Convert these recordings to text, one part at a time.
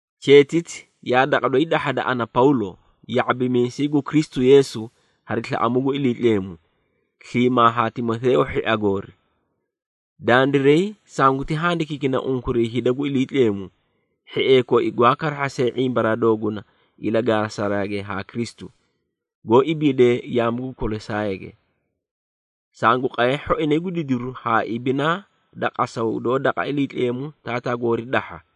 Cheetiti yaa daqa doyi dahhada ana Pawlo, ya⁄abimiisay gu Kristu Yeesu hari slaꞌamuu gu Iliitleemu, sliimaa haa Timoteeyo hhia goori. Dandiray sanguti handikiikina unkuray hida gu Iliitleemu, hhiee koi gwaa karahhasee ⁄imbaraa dooguna ilagaasage ha Kristu, goó ibiidee yaamu gu Kolosaayge. Sangu qaye hhoinay gu didiru haa ibinaa da qasaw doó daqa Iliitleemu Taataa goori dahha.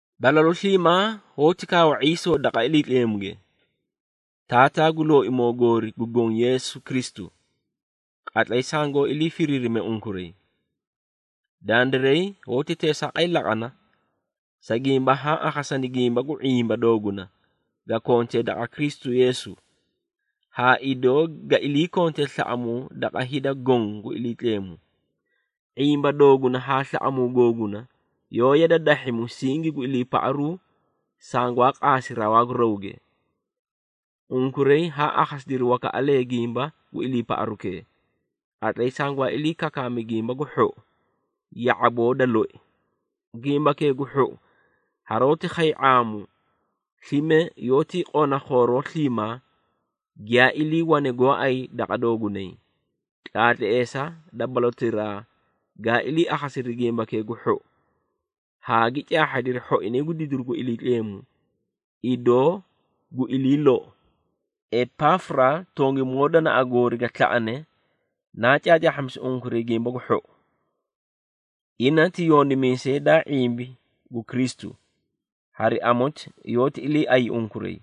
Balalu sliimaa hoóti kaawa ⁄iisoo daqa Iliitleemuge, Taataa gu Looimoo goori gu Goõ Yeesu Kristu, qatlay sangoó ilii firiirine unkuray. Dandiray hoóti teesaaqay laqana, sa gimba haã akhasani gimba gu ⁄imba dooguna ga kontee daqa Kristu Yeesu haa idoo ga ilii kontee slaꞌamuu daqa hida goõ gu Iliitleemu. ⁄imba dooguna haa slaꞌamuu googuna yoóti yada dahhi musingi gu iliipaꞌaru sangwaa qaasi rawaa gu rawge. Unkuray haa akhasidiri wakaꞌalee gimba gu iliipaꞌarukee, qatlay sangwaa ilii kakaami Gimba gu Hhou, ya⁄aboo da loi. Gimbakee gu Hhou haroóti khay ⁄aamu, slime yoótii qona khooroo sliimaa giyaa iliiwane gooay daqa doogunay, tlaatleesa da balotiraa gaa ilii akhasidiri Gimbakee gu Hhou haa gi caahhadiri hhoinay gu didiru gu Iliitleemu, idoo gu ilii lou. Epaafura tongimoo danaꞌa goori ga slaꞌane naa caacaahhamisi unkuray Gimba gu Hhou. Ina ti yondimiisay daa ⁄imbi gu Kristu, hari amoti yoóti iliiaꞌay unkuray.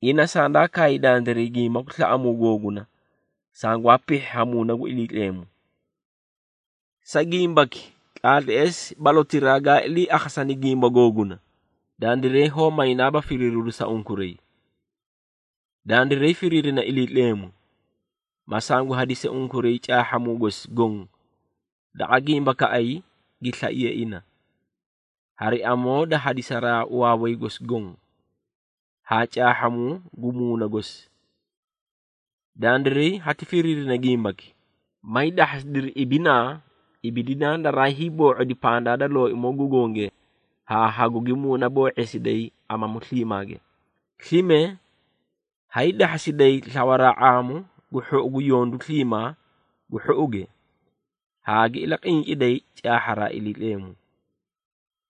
Ina sandaa kaay dandiray gimba gu slaꞌamuu googuna sangwaa pihhi ha Muuna gu Iliitleemu. Sa gimbaki tlaatleesi balotiraa gaa ilii akhasani gimba googuna, dandiray hoó maynaaba firiiriru sa unkuray. Dandiray firiirina Iliitleemu, ma sangu hadisi unkuray caahhamuu gosi goõ daqa gimbakaꞌay gi slaiye ina, hari amoo da hadisaraa waaway gosi goõ, haa caahhamuu gu Muuna gosi. Dandiray hati firiirina gimbaki, may dahhasidiri ibinaa ibidinaa daraa hiiboo⁄odi pandaa da Looimoo gu Gonge haa hagugi muunaboo⁄eesiday amamu sliimaage. Slime, hay dahhasiday slawaraa ⁄aamu gu hhou yondu sliimaa gu hhouge, haa gi ilaqinciday caahha Iliitleemu.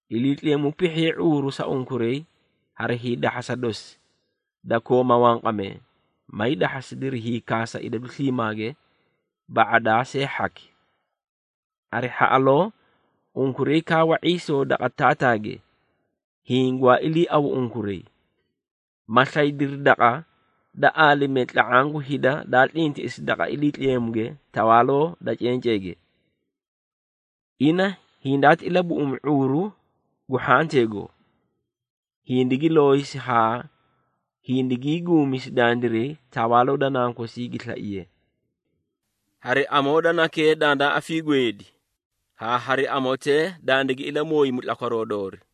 Iliitleemu pihhiye ⁄uuru sa unkuray hari hiidahhasa dosi da kooma wanqamee, may dahhasidiri hiikaasa idadu sliimaage ba⁄adaa see hhaki. Hari hhaꞌaloo unkuray kaawa ⁄iisoo daqa Taataage, hiĩ gwaa iliiawu unkuray, ma slaydiri daqa da aalimee tla⁄aã gu hida daa tlintiꞌisi daqa Iliitleemuge tawaaloo da cenceege. Ina hindaati ilabuꞌumi ⁄uuru gu hhanteego, hindigi looyisi haa hindigii guumisi dandiray tawaaloo da Nankosii gi slaiye. Hari amoo da Nakee dandaa afiigweedi, haa hari amotee dandigi ilamooyimi tlakwaroo doori.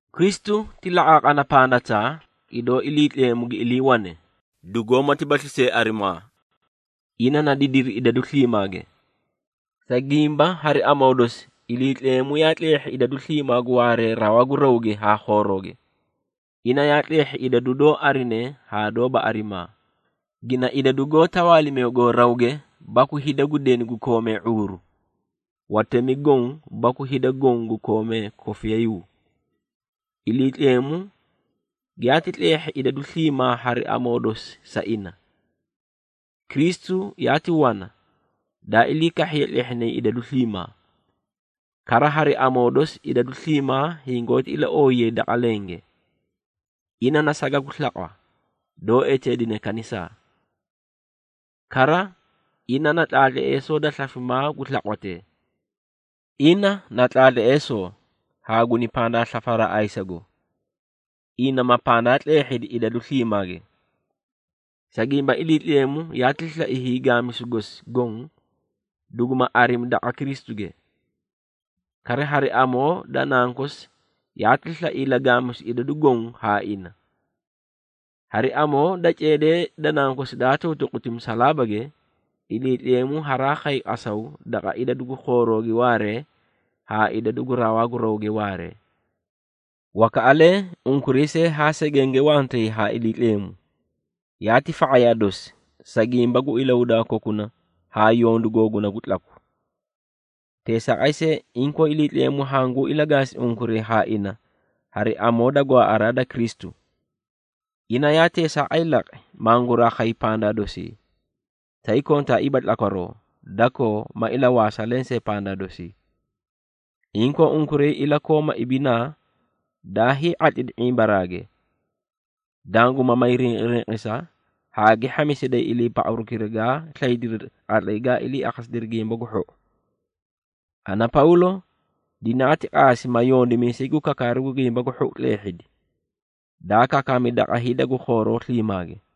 Kristu ti laqaaqana pandataa, idoo Iliitleemu gi iliiwane, dugoómatibasli see arimaa. Ina na didiri idadu sliimaage. Sa gimba hari amoo dosi, Iliitleemu yaa tleehhi idadu sliimaa gu waaree rawaa gu rawge haa khoorooge. Ina yaa tleehhi idadu doó arine haa doóba arimaa, gina idadu goó tawaalimeegoo rawge, baku hida gu deni gu koomee ⁄uuru, watemi goõ baku hida goõ gu koomee kofiyayuu. Iliitleemu giyaati tleehhi idadu sliimaa hari amoo dosi sa ina. Kristu yaati wana, daa ilii kahhiye tlehhinay idadu sliimaa. Kara, hari amoo dosi idadu sliimaa hingoóti ilaooyayi daqa lenge. Ina na saga gu slaqwa, doó eteedine kanisaa. Kara, ina na tlaatleesoo da slafimaa gu slaqwatee. Ina na tlaatleesoo, haa guni pandaa slafaraa ayisago, ina ma pandaa tleehhidi idadu sliimaage. Sa gimba, Iliitleemu yaati slai hiigaamisu gosi goõ duguma arimi daqa Kristuge. Kara, hari amoo da Nankosi yaati slai ilagaamisu idadu goõ haa ina. Hari amoo da ceedee da Nankosi daa tuutuquti musalaabage, Iliitleemu haraa khay qasaw daqa idadu gu khoorooge waaree haa idadu gu rawaa gu rawge waaree. Wakaꞌalee unkuray see haa segenge wantay haa Iliitleemu, yaati fa⁄ayaa dosi, sa gimba gu ilahudaa kokuna haa yondu googuna gu tlaku. Teesaaqay see, inkoo Iliitleemu hanguu ilagaasi unkuray haa ina hari amoo da gwaaꞌaraa da Kristu. Ina yaa teesaaqay laqi, manguraa khay pandaa dosi, tay kontaaiiba tlakwaroo, dakoo ma ilawaasa lensee pandaa dosi. Inkoo, unkuray ilakooma ibinaa daa hii⁄atlidi ⁄imbaraage, danguma may rinqirinqisa haa gi hhamisiday iliipaꞌarukira gaa slaydiri qatlay gaa ilii akhasidiri Gimba gu Hhou. Ana, Pawlo dinaati qaasi, ma yondimiisay gu kakaaru gu Gimba gu Hhou tleehhidi, daa kakaami daqa hida gu khooroo sliimaage.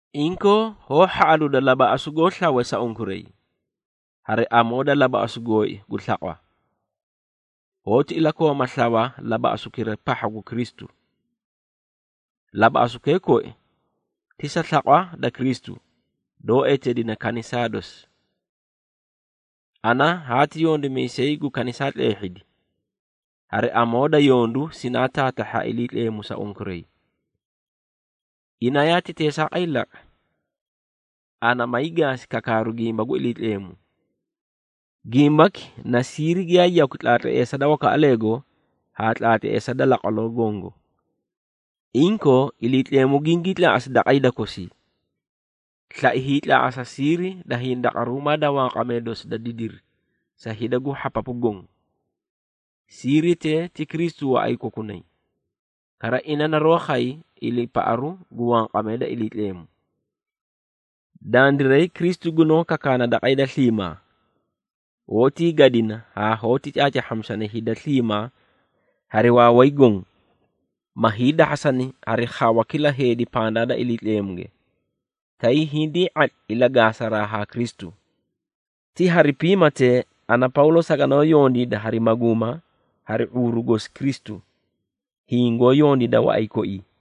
Inkoo, hoó hhaꞌaluuda labaꞌasu goó slawe sa unkuray. Hari amoo da labaꞌasu gooi gu slaqwa, hoóti ilakooma slawa labaꞌasukira pahha gu Kristu. Labaꞌasukee koi ti sa slaqwa da Kristu, doó eteedine kanisaa dosi. Ana haati yondimiisay gu kanisaa tleehhidi, hari amoo da yondu sinaa taatahhi ha Iliitleemu sa unkuray. Ina yaati teesaaqay laqi, ana may gaasi kakaaru gimba gu Iliitleemu. Gimbaki na siiri giyaa yakwi tlaatleesa da wakaꞌaleego haa tlaatleesa da laqwaloo gongo. Inkoo, Iliitleemu gingii tlaaꞌasi daqa hida kosii, slai hiitlaaꞌasa siiri da hindaqaruumaa da wanqamee dosi da didiri sa hida gu hhapapu goõ. Siiritee, ti Kristu waꞌay kokunay, kara ina naroó khay iliipaꞌaru gu wanqamee da Iliitleemu. Dandiray, Kristu gunoó kakaana daqa hida sliimaa. Hoótii gadina haa hoóti caacaahhamisana hida sliimaa hari waaway goõ, ma hiidahhasani hari khawa kila heedi pandaa da Iliitleemuge, tay hindii ⁄atli ilagaasaraa haa Kristu. Ti hari piimatee, ana Pawlo saganoó yondiida, hari maguuma hari ⁄uuru gosi Kristu, hiĩ goó yondiida waꞌay koii.